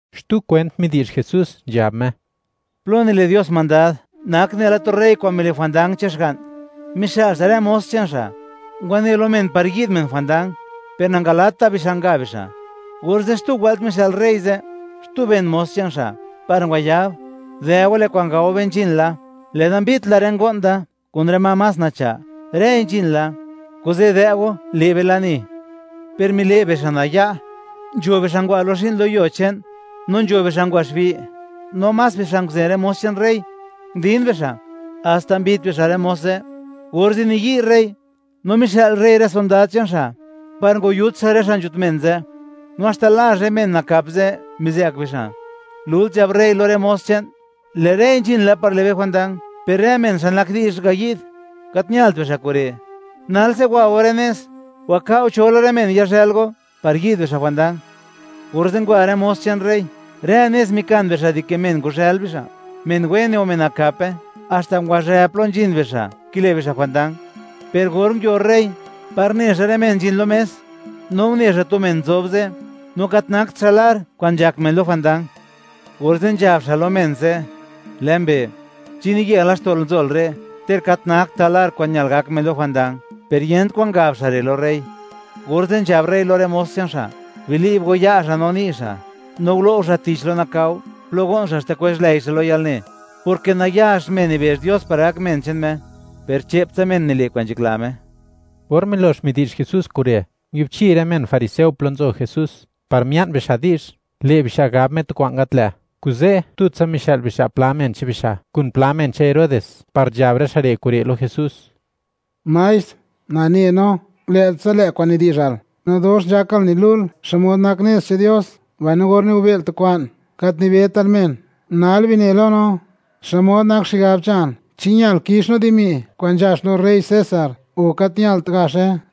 Xtu kwent midi'zh Jesús, nzhab Me: ―Plo nile' Dios mandad nak nela tu rey xa' mile' jwandang che'n xga'n, mixë'l xa' rë mos che'n xa' ngwane lo men par yi'd bixa' jwandang; per net bixa' ngayi'd bixa'. Orze' xtu wëlt mixë'l rey ze' xtu ben mos che'n xa' par ngwayab: “Dë' go, lë' kwa'n gao be nzhin la; lë'da mbit la rë ngo'n da kun rë ma más nacha', rëi nzhin la; kuze', dë' go le' be lani.” Per mile' bixa' naya'; nzho bixa' ngwa zhi'n lo yuo che'n, no nzho bixa' ngwa xbi', no más bixa' nguzen rë mos che'n rey, ndin bixa' haxta mbit bixa' rë mos ze'. Orze' niyi' rey no mixë'l rey rë sondad che'n xa' par ngwayut rë xa' nzhut men ze', no haxta lazh rë men nakap ze' mizë'k bixa'. Lult nzhab rey lo rë mos che'n: “Lë' rëi nzhin la par le' be jwandang, per rë men xa' nak di'zh ngayi'd, gat ñalt bixa' kure'; nalse wa go rë nez, waka'o cho la rë men yazhë'l go par yi'd bixa' jwandang.” Orze' ngwa rë mos che'n rey, rë nez mikan bixa' dike men ngwazhë'l bixa', men wene o men nakape, haxta ngwazhë plo nzhin bixa' kile' bixa' jwandang. Per or nguio rey par ne xa' rë men nzhin lo mes, no une xa' tu men nzob ze', no gat nakt xa' lar kwa'n nzhak men lo jwandang, orze' nzhab xa' lo men ze': “Lë' mbe', ¿chi niye laxto'l nzol re', ter gat naktal lar kwa'n ñal gak men lo jwandang?” Per yent kwan ngab xa' re' lo rey. Orze' nzhab rey lo rë mos che'n xa': “Bili'b go ya' xa' no ni' xa', no gulo' go xa' tich lo nakao, plo go'n xa' haxta kwezh lëi xa' lo yalne”, porke nayax men nibezh Dios par gak men che'n Me, per che'ptsa men nile' kwa'n nzhakla Me. Or milox midi'zh Jesús kure', nguiubchi rë men fariseo plo nzo Jesús par mia'n bixa' di'zh, le' bixa' gab Me tu kwa'n gat lë', kuze' tutsa mixë'l bixa' pla men che'n bixa' kun pla men che'n Herodes par nzhab rë xa' re' kure' lo Jesús: ―Maestr, nane no, lë'tsa lë' kwa'n nidi'zhal, no dox nzhakal nilu'l xmod nak nez che'n Dios; mbaino or nigobe'l tu kwa'n, gat nibetal men. Nal bine lo no, ¿xmod nak xigab che'nal? ¿Chi ñal kix no dimi kwa'n nzhax lo rey César, o gat ñalt gaxe?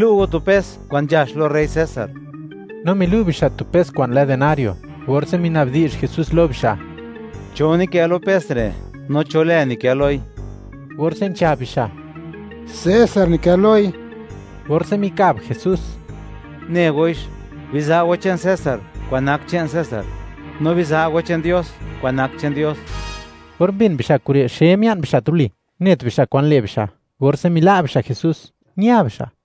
Bilu' go tu pes kwa'n nzhax lo rey César. No milu' bixa' tu pes kwa'n lë denario, orze' minabdi'zh Jesús lo bixa': ―¿Cho nikë lo pes re', no cho lë nikë loi? Orze' nzhab bixa': ―César nikë loi. Orze' mikab Jesús: ―Ne goix, biza' go che'n César kwa'n nak che'n César, no biza' go che'n Dios kwa'n nak che'n Dios. Or mbin bixa' kure', xe mia'n bixa' tuli, net bixa' kwan le' bixa', orze' mila' bixa' Jesús, ña bixa'.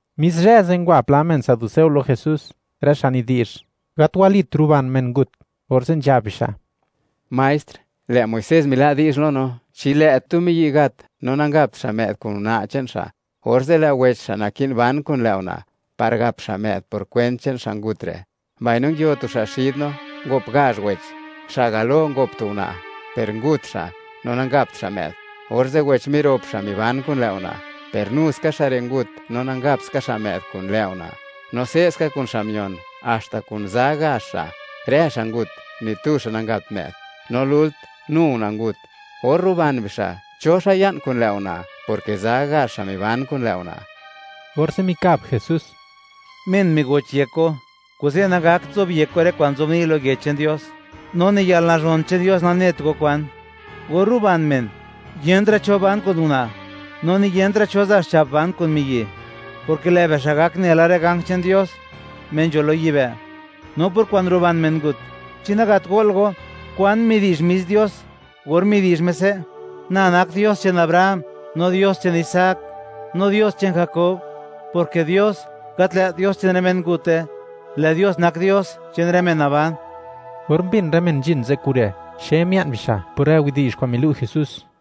Mis zhë ze', ngwa pla men saduceo lo Jesús, rë xa' nidi'zh: “Gat walit ruban men ngut”, orze' nzhab bixa': ―Maestr, lë' Muisés mila' di'zh lo no: “Chi lë' tu miyi' gat, no nangapt xa' më'd kun una' che'n xa', orze' lë' wech xa' naki'n ban kun lë' una' par gap xa' më'd por kwent che'n xa' ngut re'.” Mbaino nguio tu xa' xid no, ngop gazh wech; xa' galo ngop tu una', per ngut xa' no nangapt xa' më'd; orze' wech mirop xa' miban kun lë' una', per nu ska xa' re' ngut no nangapt ska xa' më'd kun lë' una'; no se'ska kun xa' mion, haxta kun za gazh xa', rë xa' ngut, ni tu xa' nangapt më'd; no lult, nu una' ngut. Or ruban bixa', ¿cho xa' ya'n kun lë' una'?, porke za gazh xa' miban kun lë' una'. Orze' mikab Jesús: ―Men migoch yek go, kuze' nagakt zobyek go rë kwa'n nzobni' lo Yech che'n Dios; no ni yalnazhon che'n Dios nanet go kwan. Or ruban men, yentra' cho ban kun una', no ni yentra' cho za' xcha'p ban kun miyi'; porke lë' bixa' gak nela rë ganj che'n Dios, Me nzho lo yibë'. No por kwa'n ruban men ngut, ¿chi nagat go'l go kwan midi'zh mis Dios or midi'zh Me se': “Na nak Dios che'n Abraham, no Dios che'n Isaac, no Dios che'n Jakob”? Porke Dios, gat lë't Dios che'n rë mengute, lë' Dios nak Dios che'n rë men naban. Or mbin rë men nzhin ze' kure', xe mia'n bixa' por rë widi'zh kwa'n milu' Jesús.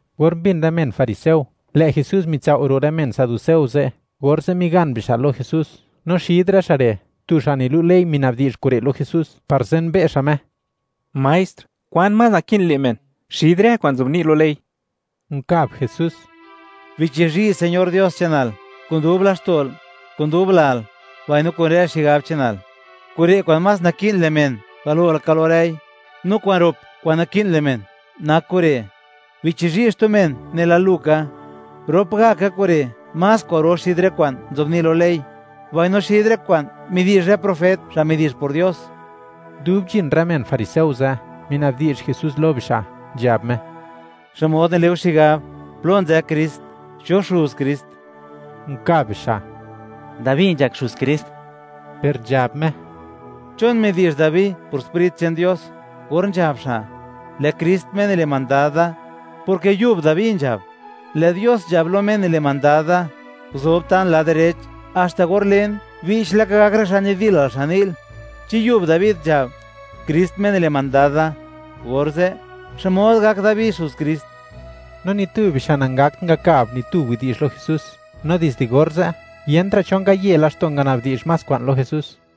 Or mbin rë men fariseo, lë' Jesús mitsao' ro' rë men saduceo ze', orze' migan bixa' lo Jesús, no xid rë xa' re', tu xa' nilu' ley mina'bdi'zh kure' lo Jesús par zenbe' xa' Me: ―Maestr, ¿kwan más naki'n le' men xid rë kwa'n nzobni' lo ley? Nkab Jesús: ―“Bichizhi' Señor Dios che'nal kun dub laxto'l, kun dub lal, mbaino kun rë xigab che'nal.” Kure' kwa'n más naki'n le' men galo laka lo rëi; No kwa'n rop kwa'n naki'n le' men nak kure': “Bichizhi' xtu men, nela lu ka.” Rop gaka kure' más kwa'ro xid rë kwa'n nzobni' lo ley, mbaino xid rë kwa'n midi'zh rë profet, xa' midi'zh por Dios. Dub nzhin rë men fariseo ze', mina'bdi'zh Jesús lo bixa', nzhab Me: ―¿Xmod nile' go xigab, plo nzë Krist? ¿Cho Xuz Krist? Nkab bixa': ―Dabi nzhak xuz Krist. Per nzhab Me: ―¿Chon midi'zh Dabi, por Sprit che'n Dios, or nzhab xa': “Lë' Krist, Me nile' mandad da”, porke yub Dabi nzhab: Lë' Dios nzhab lo Me nile' mandad da: “Guzob ta'n lad direch haxta or len, che'ptsa (bi'ch laka) gak rë xa' nidilal, xan ni'l”? Chi yub Dabi nzhab: “Krist Me nile' mandad da”, orze', ¿xmod gak Dabi Xuz Krist? No ni tu bixa' nangakt ngakab ni tu widi'zh lo Jesús, no dizde orze', yent ra' cho ngaye laxto' ngana'bdi'zh más kwa'n lo Jesús.